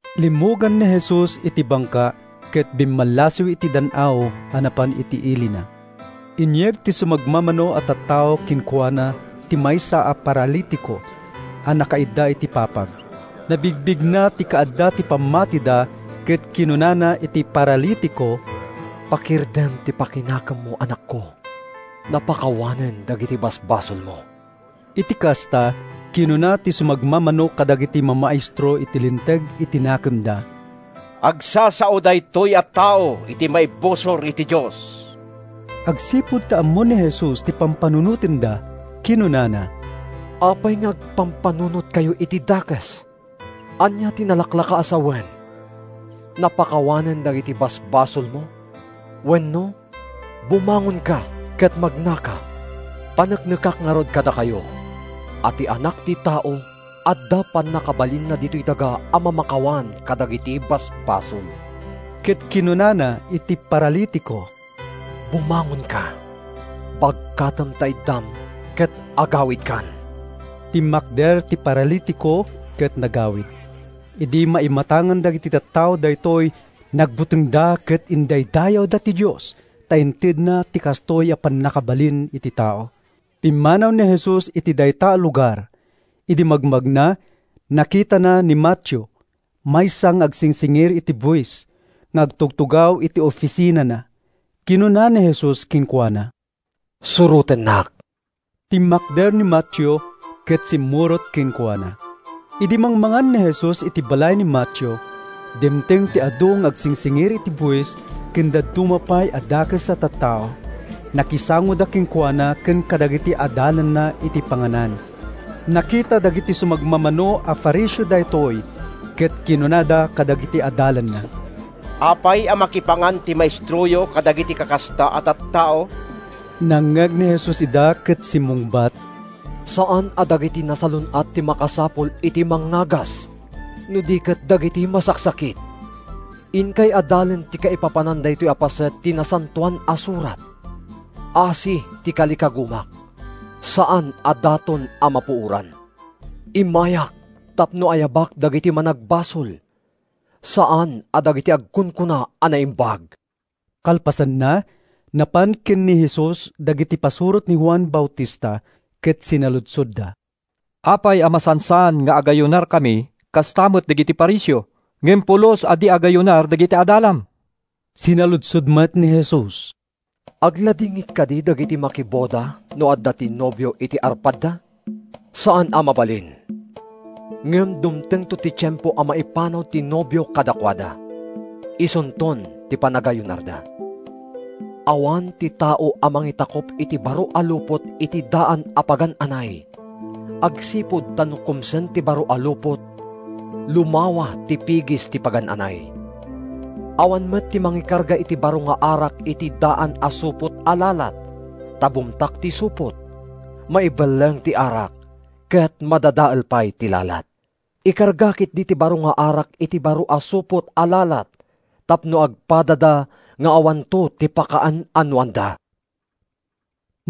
Limmugan ni Jesus iti bangka ket bimmallasiw iti dan-aw a napan iti ilina. Inyeg ti sumagmamano a tattao kenkuana ti maysa a paralitiko a nakaidda iti papag. Nabigbigna ti kaadda ti pammatida ket kinunana iti paralitiko, “Pakirdem ta pakinakemmo, anakko. Napakawanen dagiti basbasolmo.” Iti kasta, kinuna ti sumagmamano kadagiti mamaestro iti Linteg iti nakemda, “Agsasao daytoy a tao iti maibusor iti Dios.” Agsipud ta ammo ni Jesus ti pampanunotenda, kinunana, “Apay nga agpampanunotkayo iti dakes? Ania ti nalaklaka a sawen, ‘Napakawanen dagiti basbasolmo,’ wenno, ‘Bumangonka ket magnaka’? Paneknekak ngarud kadakayo a ti Anak ti Tao adda pannakabalinna ditoy daga a mamakawan kadagiti basbasol.” Ket kinunana iti paralitiko, “Bumangonka, bagkatem ta iddam ket agawidkan.” Timmakder ti paralitiko ket nagawid. Idi maimatangan dagiti tattao daytoy, nagbutengda ket indaydayawda ti Dios ta intedna ti kastoy a pannakabalin iti tao. Pimmanaw ni Jesus iti dayta a lugar. Idi magmagna, nakitana ni Mateo, maysa nga agsingsingir iti buis, nga agtugtugaw iti ofisinana. Kinuna ni Jesus kenkuana, “Surotennak.” Timmakder ni Mateo ket simmurot kenkuana. Idi mangmangan ni Jesus iti balay ni Mateo, dimteng ti adu nga agsingsingir iti buis ken dadduma pay a dakes a tattao. Nakisangoda kenkuana ken kadagiti adalanna iti panganan. Nakita dagiti sumagmamano a Fariseo daytoy, ket kinunada kadagiti adalanna, “Apay a makipangan ti maestroyo kadagiti kakasta a tattao?” Nangngeg ni Jesus ida ket simmungbat: “Saan a dagiti nasalun-at ti makasapul iti mangngagas, no di ket dagiti masaksakit. Inkay adalen ti kaipapanan daytoy a paset ti Nasantoan a Surat, ‘Asi ti kalikagumak, saan a daton a mapuoran.’ Immayak tapno ayabak dagiti managbasol, saan a dagiti agkunkuna a naimbag.” Kalpasanna, napan ken ni Jesus dagiti pasurot ni Juan Bautista ket sinaludsodda, “Apay a masansan nga agayunarkami kasta met dagiti Fariseo, ngem pulos a di agayunar dagiti adalam?” Sinaludsod met ni Jesus, “Agladingit kadi dagiti makiboda no adda ti nobio iti arpadda? Saan a mabalin! Ngem dumtengto ti tiempo a maipanaw ti nobio kadakuada; isunton ti panagayunarda. “Awan ti tao a mangitakup iti baro a lupot iti daan a pagan-anay, agsipud ta no kumsen ti baro a lupot, lumawa ti pigis ti pagan-anay. Awan met ti mangikarga iti baro nga arak iti daan a supot a lalat, ta bumtak ti supot, maibelleng ti arak, ket madadael pay ti lalat. Ikarga ketdi ti baro nga arak iti baro a supot a lalat tapno agpadada nga awanto ti pakaan-anoanda.”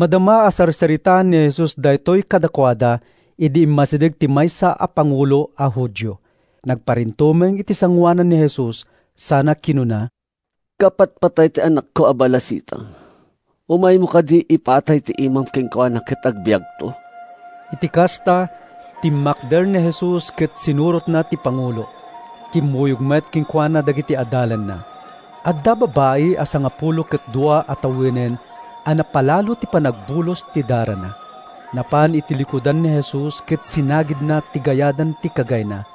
Madama a sarsaritaen ni Jesus daytoy kadakuada idi immasideg ti maysa a pangulo a Judio. Nagparintumeng iti sangoanan ni Jesus sana kinuna, “Kapatpatay ti anakko a balasitang. Umaymo kadi ipatay ta imam kenkuana ket agbiagto.” Iti kasta, timmakder ni Jesus ket sinurotna ti pangulo. Kimmuyog met kenkuana dagiti adalanna. Adda babai a sangapulo ket dua a tawenen a napalalo ti panagbulos ti darana. Napan iti likudan ni Jesus ket sinagidna ti gayadan ti kagayna.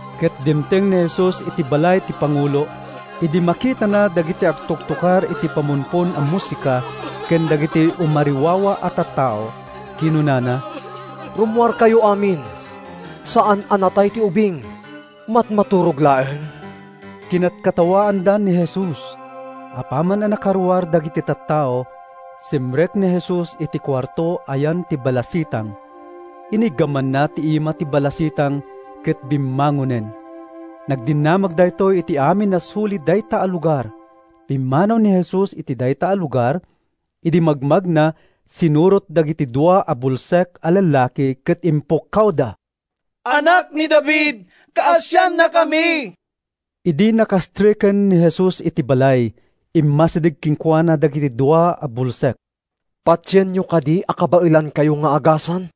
Ket dimteng ni Jesus iti balay ti pangulo. Idi makitana dagiti agtuktukar iti pamumpon a musika ken dagiti umariwawa a tattao, kinunana, “Rummuarkayo amin! Saan a natay ti ubing—matmaturog laeng.” Kinatkatawaanda ni Jesus. Apaman a nakaruar dagiti tattao, simrek ni Jesus iti kuarto a yan ti balasitang. Iniggamanna ti ima ti balasitang ket bimmangonen. Nagdinamag daytoy iti amin a suli dayta a lugar. Pimmanaw ni Jesus iti dayta a lugar. Idi magmagna, sinurot dagiti dua a bulsek a lallaki ket impukkawda, “Anak ni David, kaasiannakami!” Idi nakastreken ni Jesus iti balay, immasideg kenkuana dagiti dua a bulsek. “Patienyo kadi a kabaelankayo nga agasan?”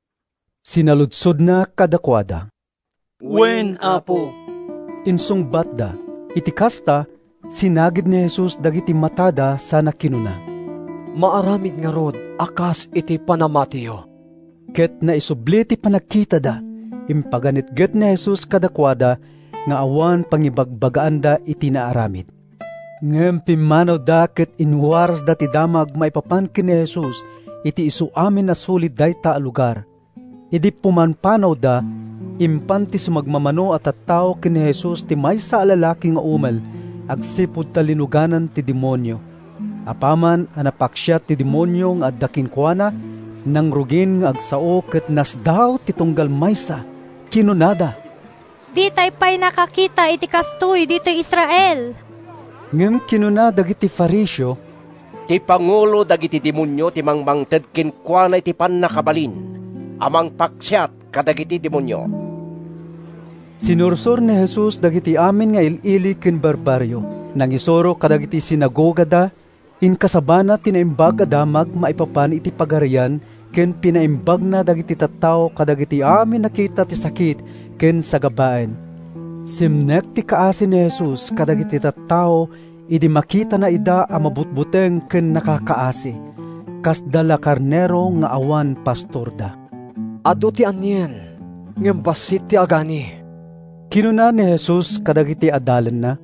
sinaludsodna kadakuada. “Wen, Apo,” insungbatda. Iti kasta, sinagid ni Jesus dagiti matada sana kinuna, “Maaramid ngarud a kas iti panamatiyo.” Ket naisubli ti panagkitada. Impaganetget ni Jesus kadakuada nga awan pangibagbagaanda iti naaramid. Ngem pimmanawda ket inwarasda ti damag maipapan ken ni Jesus iti isuamin a suli dayta a lugar. Idi pumampanawda, impan ti sumagmamano a tattao ken ni Jesus ti maysa a lalaki nga umel agsipud ta linuganan ti demonio. Apaman a napaksiat ti demonio nga adda kenkuana, nangrugin nga agsao ket nasdaaw ti tunggal maysa. Kinunada, “Ditay pay nakakita iti kastoy ditoy Israel!” Ngem kinuna dagiti Fariseo, “Ti pangulo dagiti demonio ti mangmangted kenkuana iti pannakabalin a mangpaksiat kadagiti demonio.” Sinursor ni Jesus dagiti amin nga il-ili ken barbarrio. Nangisuro kadagiti sinagogada, inkasabana ti Naimbag a Damag maipapan iti Pagarian ken pinaimbagna dagiti tattao kadagiti amin a kita ti sakit ken sagabaen. Simnek ti kaasi ni Jesus kadagiti tattao idi makitana ida a mabutbuteng ken nakakaasi. Kasda la karnero nga awan pastorda. “Adu ti anien, ngem bassit ti agani,” kinuna ni Jesus kadagiti adalanna.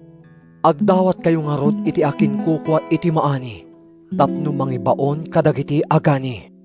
“Agdawatkayo ngarud iti akinkukua iti maani tapno mangibaon kadagiti agani.”